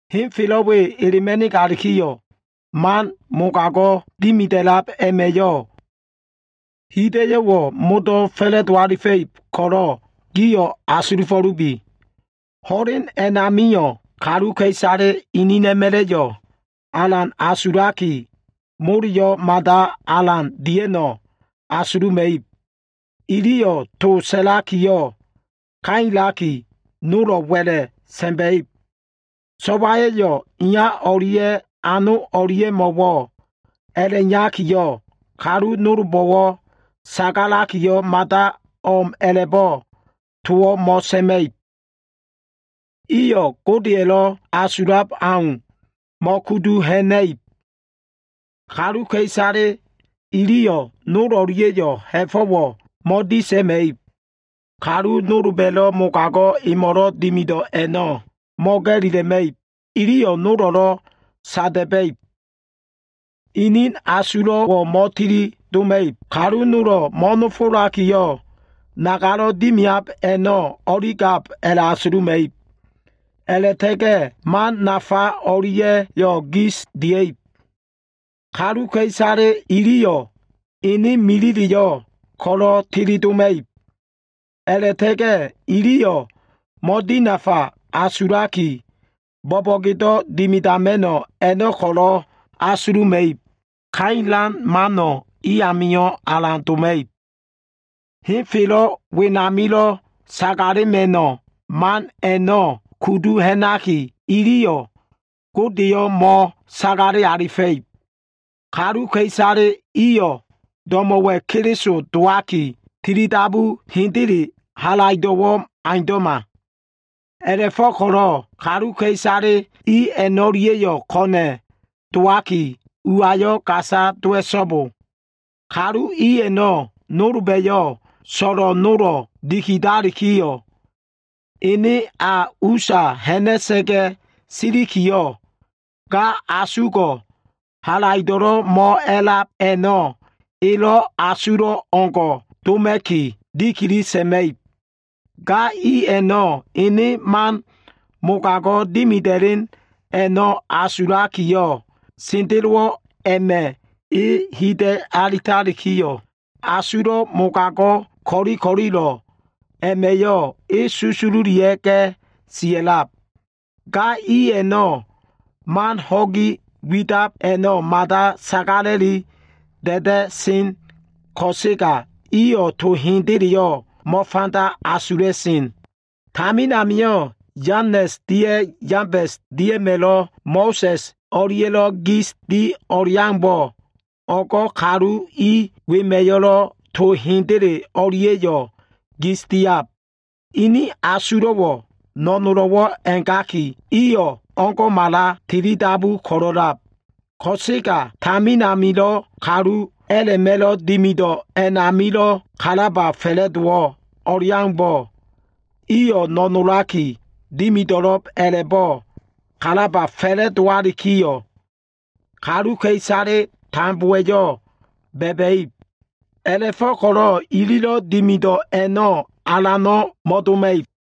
Ho꞉len we elema꞉nigalikiyo꞉, man mogago꞉lo꞉ dimida꞉lab a꞉ma꞉yo꞉, hida꞉yo꞉wo꞉ modo꞉ fa꞉la꞉do alifa꞉ib ko꞉lo꞉ giyo꞉ asulufo꞉lubi. Ho꞉len a꞉namio꞉, kaluka꞉isale inina꞉ma꞉la꞉yo꞉ alan asulaki, moleyo꞉ mada alan dia꞉no꞉ asuluma꞉ib. Iyo꞉ to sa꞉lakiyo꞉ kailaki, nolo꞉ wa꞉la꞉ sa꞉ma꞉ib. So꞉waya꞉yo꞉ iya o꞉lia꞉ ano o꞉lia꞉mo꞉wo꞉ a꞉la꞉iyakiyo꞉, kalu nolbo꞉wo꞉ sagalakiyo꞉ mada o꞉m a꞉la꞉bo꞉ towo꞉ mo꞉sa꞉ma꞉ib. Iyo꞉ Godeya꞉lo꞉ asulab aumbo꞉ mo꞉kudu ha꞉na꞉ib. Kaluka꞉isale iliyo꞉ nol o꞉lia꞉yo꞉ ha꞉fo꞉wo꞉ mo꞉disa꞉ma꞉ib. Kalu nolba꞉lo꞉ mogago꞉ emo꞉lo꞉ dimido꞉ a꞉no꞉ mo꞉ga꞉lila꞉ma꞉ib. Iliyo꞉ nolo꞉lo꞉ sada꞉ba꞉ib. Inin asulo꞉wo꞉ mo꞉tilidoma꞉ib. Kalu nolo꞉ mo꞉nofolakilo꞉ nagalo꞉ dimiab a꞉no꞉ o꞉ligab a꞉la꞉asuluma꞉ib. A꞉la꞉ta꞉ga꞉ iliyo꞉ man nafa o꞉lia꞉yo꞉ gis dia꞉ib. Kaluka꞉isale iliyo꞉ ene milileyo꞉ ko꞉lo꞉ teledoma꞉ib. A꞉la꞉ta꞉ga꞉ iliyo꞉ mo꞉dinafa asulaki, bo꞉bo꞉gedo꞉ dimidama꞉no꞉ a꞉no꞉ ko꞉lo꞉ asuluma꞉ib. Kailan mano꞉ i amio꞉ alan doma꞉ib. Henfelo꞉ wenamilo꞉ sagalema꞉no꞉ man a꞉no꞉ kudu ha꞉naki, iliyo꞉ Godeyo꞉ mo꞉sagale alifa꞉ib. Kaluka꞉isale iyo꞉ do꞉mo꞉wa꞉ Keliso dowaki, tilidabu hendeleyo꞉ halaido꞉wo꞉ aundo꞉ma. A꞉la꞉fo꞉ko꞉lo꞉ kaluka꞉isale i a꞉no꞉lia꞉yo꞉ ko꞉na꞉ dowaki, uayo꞉ gasa dowa꞉so꞉bo. Kalu i nolba꞉yo꞉ so꞉lo꞉ nolo꞉ dikidakiyo꞉, ene a usa ha꞉na꞉sa꞉ga꞉ silikiyo꞉, ga asugo꞉ halaido꞉lo꞉ mo꞉a꞉lab a꞉no꞉ elo꞉ asulo꞉ o꞉leo꞉ngo꞉ doma꞉ki, dikili sa꞉ma꞉ib. Ga i a꞉no꞉ ene man mogago꞉ dimida꞉len a꞉no꞉ asulakiyo꞉, sendelowo꞉ a꞉ma꞉ e hida꞉ alitalikiyo꞉, asulo꞉ mogago꞉ ko꞉li ko꞉lilo꞉ a꞉ma꞉yo꞉ e susululia꞉ga꞉ sia꞉lab. Ga i a꞉no꞉ to man ho꞉gi widab a꞉no꞉ mada sagala꞉li da꞉da꞉sen ko꞉sega, iyo꞉ to hendeleyo꞉ mo꞉fanda asula꞉sen. Tamin amio꞉ Yanes dia꞉ Yambes dia꞉ma꞉lo꞉ Mo꞉sa꞉s o꞉lia꞉lo꞉ gis di o꞉leaumbo꞉, o꞉go꞉ kalu i wema꞉yo꞉lo꞉ to hendele o꞉lia꞉yo꞉ gis diab. Inin asulo꞉wo꞉ no꞉nolo꞉wo꞉ a꞉gaki, iyo꞉ o꞉ngo꞉mala tilidabu ko꞉lo꞉lab. Ko꞉sega tamin amilo꞉ kalu a꞉la꞉ma꞉lo꞉ dimido꞉ a꞉namilo꞉ kalaba fa꞉la꞉dowo꞉ aumbo꞉, iyo꞉ no꞉nolaki dimido꞉lo꞉b a꞉la꞉bo꞉ kalaba fa꞉la꞉dowalikiyo꞉, kaluka꞉isale tambowa꞉yo꞉ ba꞉ba꞉ib. A꞉la꞉fo꞉ko꞉lo꞉ ililo꞉ dimido꞉ a꞉no꞉ alano꞉ mo꞉doma꞉ib.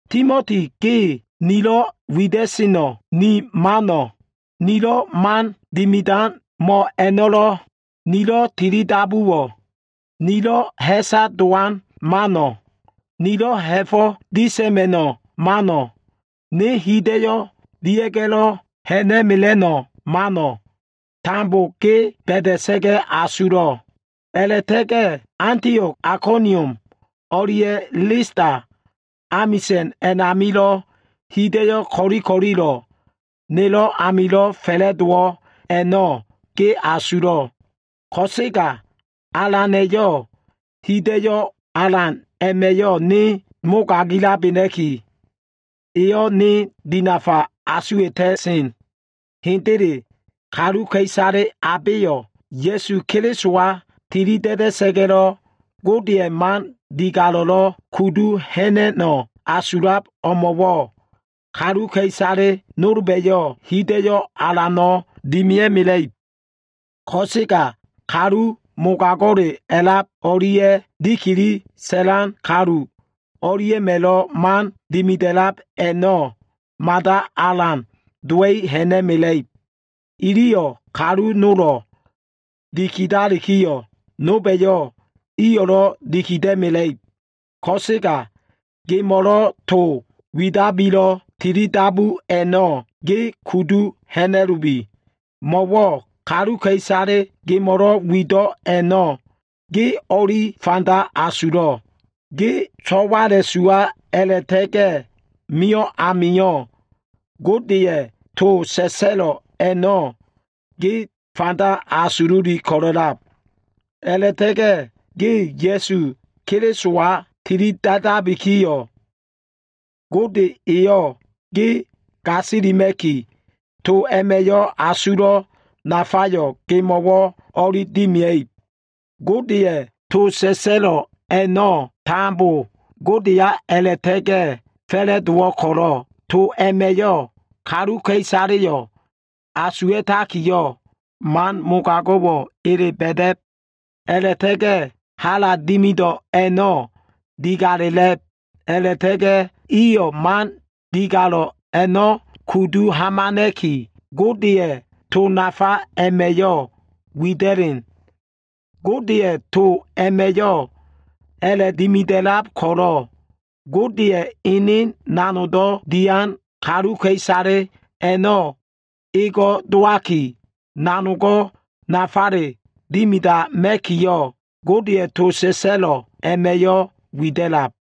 Timoti ge, nilo꞉ wida꞉seno꞉, ni mano꞉, nilo꞉ man dimidan mo꞉ a꞉no꞉lo꞉, nilo꞉ tilidabuwo꞉, nilo꞉ ha꞉sa dowan mano꞉, nilo꞉ ha꞉fo꞉ disa꞉ma꞉no꞉ mano꞉, ne hida꞉yo꞉ dia꞉ga꞉lo꞉ ha꞉na꞉mela꞉no꞉ man a꞉no꞉ tambo, ge ba꞉da꞉sa꞉ga꞉ asulo꞉. A꞉la꞉ta꞉ga꞉ Antio꞉g, Aikonium o꞉lia꞉ Lista amisa꞉n a꞉namilo꞉ hida꞉yo꞉ ko꞉li ko꞉lilo꞉ nelo꞉ amilo꞉ fa꞉la꞉dowo꞉ a꞉no꞉ ge asulo꞉. Ko꞉sega Alana꞉yo꞉ hida꞉yo꞉ alan a꞉ma꞉yo꞉ ne mogagilabena꞉ki, eyo꞉ ne dinafa asuwa꞉ta꞉sen. Hendele, kaluka꞉isale abeyo꞉ Ya꞉su Kelisowa tilida꞉da꞉sa꞉ga꞉lo꞉, Godeya꞉ man digalo꞉lo꞉ kudu ha꞉na꞉no꞉ asulab o꞉mo꞉wo꞉, kaluka꞉isale nolba꞉yo꞉ hida꞉yo꞉ alano꞉ dimia꞉mela꞉ib. Ko꞉sega kalu mogago꞉le a꞉lab o꞉lia꞉ dikili sa꞉lan kalu o꞉lia꞉ma꞉lo꞉ man dimida꞉lab a꞉no꞉ mada alan dowa꞉i ha꞉na꞉mela꞉ib. Iliyo꞉ kalu nolo꞉ dikidalikiyo꞉, nolba꞉yo꞉ iyo꞉lo꞉ dikida꞉mela꞉ib. Ko꞉sega gemo꞉lo꞉ to widabilo꞉ tilidabu a꞉no꞉, ge kudu ha꞉na꞉lubi. Mo꞉wo꞉ kaluka꞉isale gemo꞉lo꞉ wido꞉ a꞉no꞉ ge o꞉li fanda asulo꞉. Ge so꞉wala꞉suwa a꞉la꞉ta꞉ga꞉ mio꞉ amio꞉, Godeya꞉ to sa꞉sa꞉lo꞉ a꞉no꞉ ge fanda asululi ko꞉lo꞉lab. A꞉la꞉ta꞉ga꞉ ge Ya꞉su Kelisowa tilida꞉dabikiyo꞉, Gode eyo꞉ ge gasilima꞉ki, to a꞉ma꞉yo꞉ asulo꞉ nafayo꞉ gemo꞉wo꞉ o꞉li dimia꞉ib. Godeya꞉ to sa꞉sa꞉lo꞉ a꞉no꞉ tambo Godeya a꞉la꞉ta꞉ga꞉ fa꞉la꞉dowo꞉ ko꞉lo꞉, to a꞉ma꞉yo꞉ kaluka꞉isaleyo꞉ asuwa꞉takiyo꞉, man mogago꞉wo꞉ ele ba꞉da꞉b, a꞉la꞉ta꞉ga꞉ hala dimido꞉ a꞉no꞉ digalela꞉b, a꞉la꞉ta꞉ga꞉ iyo꞉ man digalo꞉ a꞉no꞉ kudu hamana꞉ki, Godeya꞉ to nafa a꞉ma꞉yo꞉ wida꞉len. Godeya꞉ to a꞉ma꞉yo꞉ a꞉la꞉dimida꞉lab ko꞉lo꞉, Godeya꞉ ene nanogdo꞉ dian kaluka꞉isale a꞉no꞉ ego꞉ dowaki, nanogo꞉ nafale dimidama꞉kiyo꞉, Godeya꞉ to sa꞉sa꞉lo꞉ a꞉ma꞉yo꞉ wida꞉lab.